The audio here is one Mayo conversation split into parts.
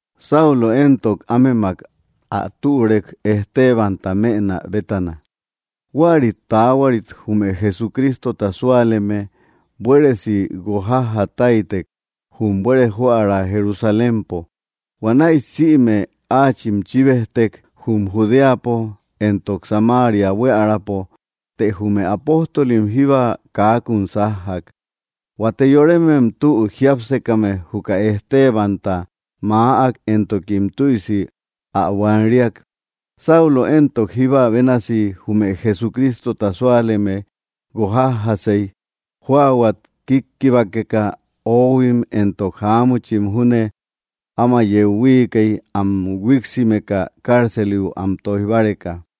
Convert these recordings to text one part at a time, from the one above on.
Saulo éntok, ámemak ä türek Estebanta mënä bétana. Huäri taahuarit jume Jesucrístota súaleme buéresi guokjájja táitek jum buere joära Jerusalémpo. Huanäi sïme áachim chíbejtek jum Judéapo éntok Samaria buiärapo, të jume apóstolim jíba kaakum sájjak. Huate yorémem tü jiápsekame juka Estebanta maäk, éntokim tüisi ä buan‑riak. Saulo éntok, jíba bénasi jume Jesucrístota súaleme guok jájjasei jóahuat kikkibákeka; oóhuim éntok jaámuchim júne áma yeu huiikei am huíksimeka cárceliu am toij báreka.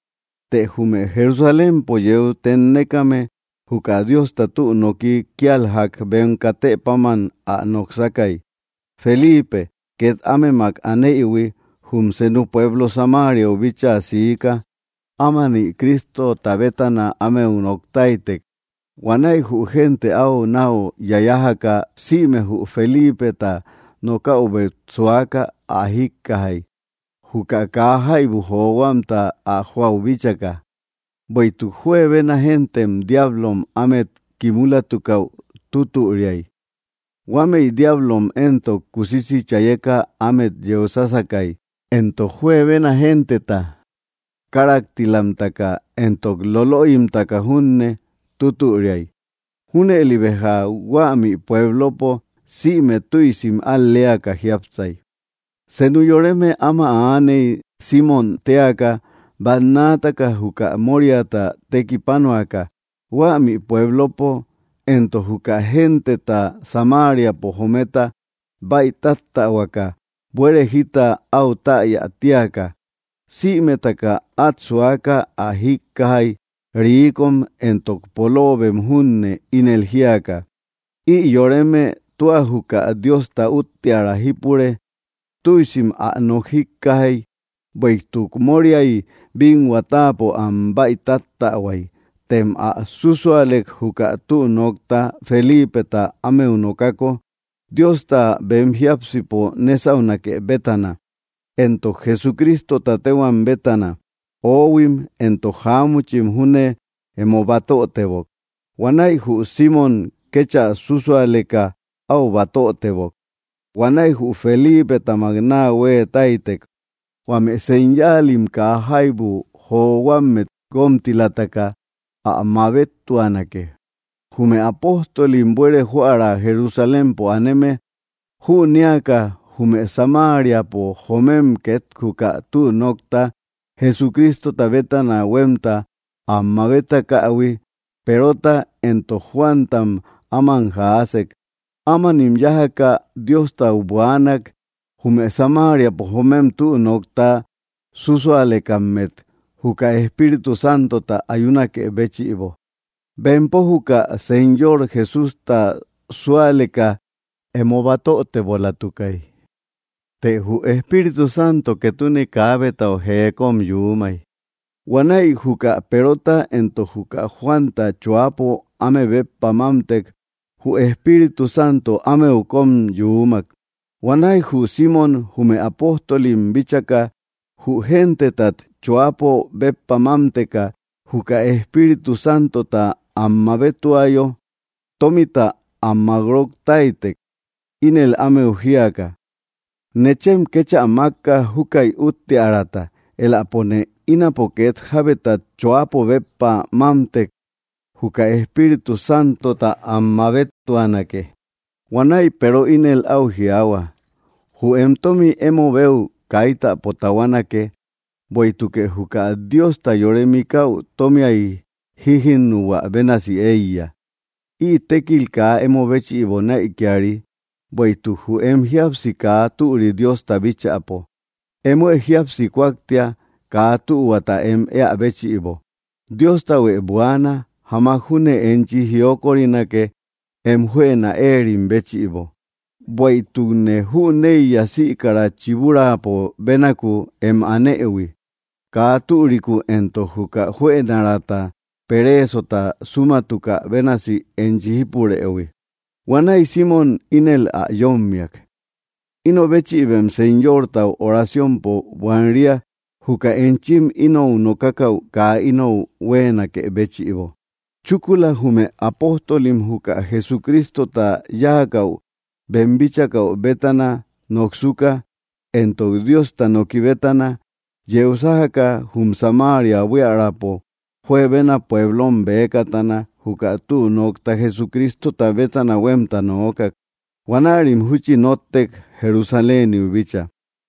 Të jume Jerusalémpo yeu tennékame juka Diosta tü nooki kia jak bem katë páman ä noksakai. Felipe, ket ámemak aneïhui, jum senu pueblo Samariau bíchaa siika ámani Crístota bétana ámeu noktáitek. Huanäi jü génte au nau yayájaka, sïme jü Felípeta nokáubet suaka ä jíkkajai, juka kaa jaibu johuamta ä joäu bíchaka. Bueïtuk juebena géntem diáblom ámet kimúlatukäu tútüriai. Huámëi diablom éntok, kusisi chayeka ámet yeu sásakai. Entok juebena genteta káraktilamtaka, éntok lolöimtaka junne tútüriai. Júnëli béja huämi puéblopo sïme tüisim al‑léaka jiápsai. Senu yoreme áma aaney Simmom téaka, bannaataka juka móriata tekipánoaka huämi puéblopo, éntok juka genteta Samáriapo jometa baítáttähuakä, buere jita au täya tíaka. Sïmetaka at suaka ä jíkkajai, ríikom éntok polóobem junne, ínel jíaka: —Ï yoreme tua juka Diosta útteara jípure. Tüisim ä nok jíkkajai, bueïtuk móriay bínhua táapo am bäitáttähuai. Tëm ä susualek juka tü nokta Felípeta ámeu nokako, Diosta bem jiápsipo nésaunake bétana, éntok Jesucrístota téhuam bétana, oóhuim éntok jaámuchim júne emo batötebok. Huanäi jü Simmom kéchä súsualeka au batötebok. Huanäi jü Felípetamak naa hueetáitek, huame señáalim kaa jaibu johuámmet guómtilataka ä mabéttuanake. Jume apóstolim buere joära Jerusalémpo aneme jünéaka jume Samáriapo joomem ket juka tü nokta Jesucrístota bétana huemta am mabétakähui, Perota éntok Juántam áman jaásek. Ámanim yájaka Diostau buaanak jume Samariapo joomem tü nokta súsualekammet juka Espíritu Santota ayunakë béchïbo. Bempo juka Señor Jesústa súaleka emo batötebolatukai, të jü Espíritu Santo ketune kaabetau jee kom yuumai. Huanäi juka Perota éntok juka Juanta choápo áme béppa mámtek, jü Espiírtu Santo ámeu kom yuumak. Huanäi jü Simmom jume apóstolim bíchaka jü gentetat choápo béppa mámteka juka Espíritu Santota am mabéttuayo, tómita am makróktaitek ínel ámeu jíaka: —Nechem kéchä makka júkäi uttearata, éläpone ínapo ket jábetat choápo béppa mámtek juka Espíritu Santota ä mabéttuanake. Huanäi Peero ínel au jiaahua: —Jü em tommi emo beu kaitäpo tahuánake, bueïtukë juka Diosta yore mikäu tómiay jíjinuhuä bénasë eiya. Ï tékil kaa emo béchïbo näikiari, bueïtuk jü em jíapsi kaa türi Diosta bíchäpo. Émoë jíapsi kúaktia kaa tühuata em éä béchïbo. Dióstahuë buaana, jamak júne enchi jiókorinake em juëna éerim béchïbo. Bueïtukne jüneiya sïkara chibúraapo bénaku em anëhui, kaa türiku, éntok juka juënaraata peréesota súmatuka bénasi enchi jípurëhui. Huanäi Simmom ínel ä yómmiak: —Ino béchïbem Señortau oraciompo buan‑ria juka enchim inou nokákäu kaa inou huéenakë béchïbo. Chúkula jume apóstolim juka Jesucrístota yákäu bem bíchakäu bétana noksuka, éntok Diosta noki bétana, yeu sájaka jum Samaria buíaräpo juebena puéblom bëkatana juka tü nokta Jesucrístota bétana huemta noókak. Huanärim júchi nóttek Jerusaléniu bícha.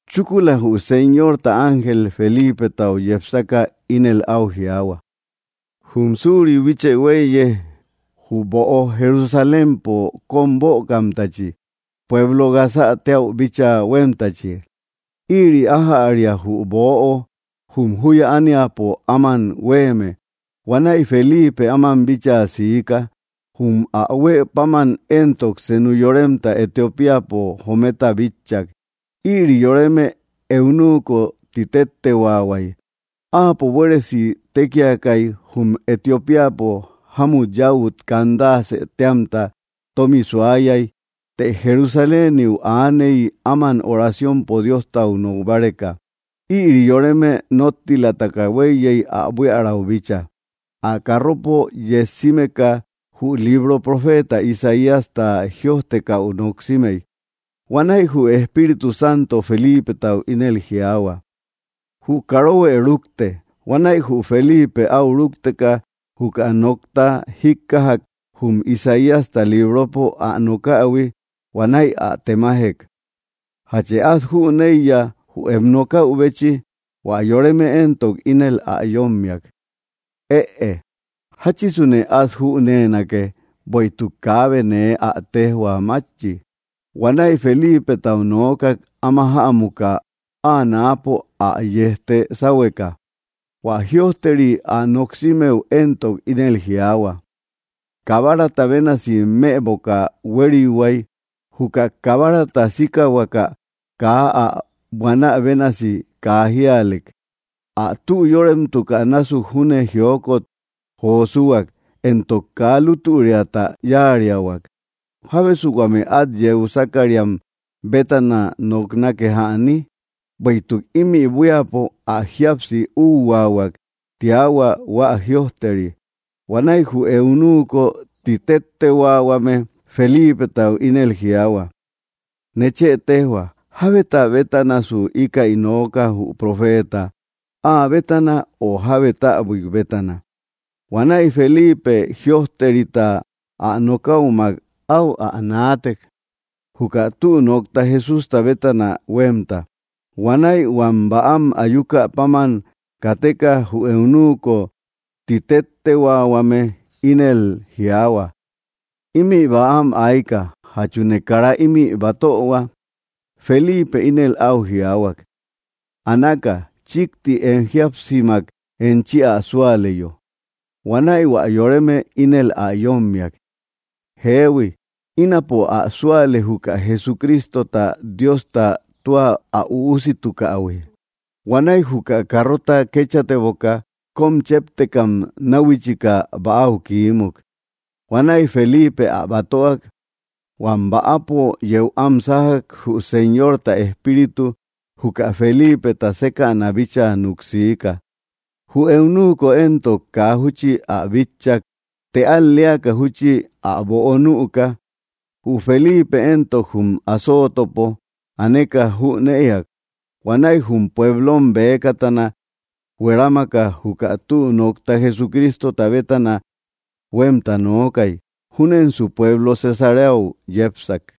Chúkula, jü Señorta ángel Felípetau yepsaka ínel au jiaahua: —Jum suriu bíchë huéiye, jü böo Jerusalémpo kom bökamtachi, pueblo Gazä téäu bíchaa huémtachi. Ïri ájäria jü böo jum juya ániapo áman huéeme. Huanäi Felipe áman bíchaa siika. Jum ä huë páman éntok, senú yoremta Etiopíapo jometa bitchak. Ïri yoreme eunuko ti téttehuaahuai. Áapo buéresi tékiakai, jum Etiopíapo jámut yäut, Candace téamta, tomi suayai, të Jerusaléniu aaney áman oraciompo Diostau nok báreka. Ïri yoreme nóttilataka hueiyei ä buíaräu bícha. Ä carropo yejsímeka jü libro profeta Isaíasta jïojtekäu noksimei. Huanäi jü Espíritu Santo Felípetau ínel jiaahua: —Jü karohuë rukte. Huanäi jü Felipe au rúkteka juka nokta jíkkajak jum Isaíasta libropo ä nokähui. Huanäi ä temajek: —¿Játchë at jüneiya jü em nokäubechi? Huä yoreme éntok, ínel ä yómiak: —Ëe, ¿jachisune at júnenake, bueïtuk kaabe nee ä téjhua mátchi? Huanäi Felípetau noókak áma ä jämuka áa náapo áa yejte sáhueka. Huä jïojteri ä noksímëu éntok, ínel jiaahua: Kabarata bénasi mëboka huériuhuay. Juka kabárata síkahuakä kaa áa buanä bénasi, kaa jíalek. Ä tü yóremtukänásuk júne jiokot jo súuhuak, éntok kaa lútüriata yáariahuak. ¿Jábesu huame at yeu sákariam bétana noknake jäni? Bueïtuk ímï buíapo ä jíapsi úhuaahuak, tiahua hua jïojteri. Huanäi jü eunuko titéttehuaahuame Felípetau ínel jiaahua: —Nechë tejhua, ¿jábeta bétanasu íkäi nooka jü profeta, áa bétana o jábe táabuik bétana? Huanäi Felipe jïojterita ä nokäumak au ä naatek juka tü nokta Jesústa bétana huemta. Huanäi huam bäam ayúkä páman kateka jü eunuko titéttehuaahuame ínel jiaahua: —Imi bäam aika, ¿játchune kara imi batöhua? Felipe ínel au jiaahuak: —Anáka chikti em jíapsimak enchi ä súaleyo. Huanäi hua yoreme ínel ä yommiak: —Jéehui, ínapo ä súale juka Jesucrístota Diosta tua ä Üusitukähui. Huanäi juka carrota kéchateboka, kom chéptekam náuhuichika bäau kiímuk. Huanäi Felipe ä batöak. Huam bäpo yéu am sájak, jü Señorta Espíritu juka Felípeta sékäna bíchaa nuksiika. Jü eunuko éntok, kaa júchi ä bitchak, të al‑leaka júchi ä böo nüka. Jü Felipe éntok, jum Azótöpo aneka jünëak. Huanäi jum puéblom bëkatana huerámaka juka tü nokta Jesucrístota bétana huemta nookai. Júnensu pueblo Cesareau yépsak.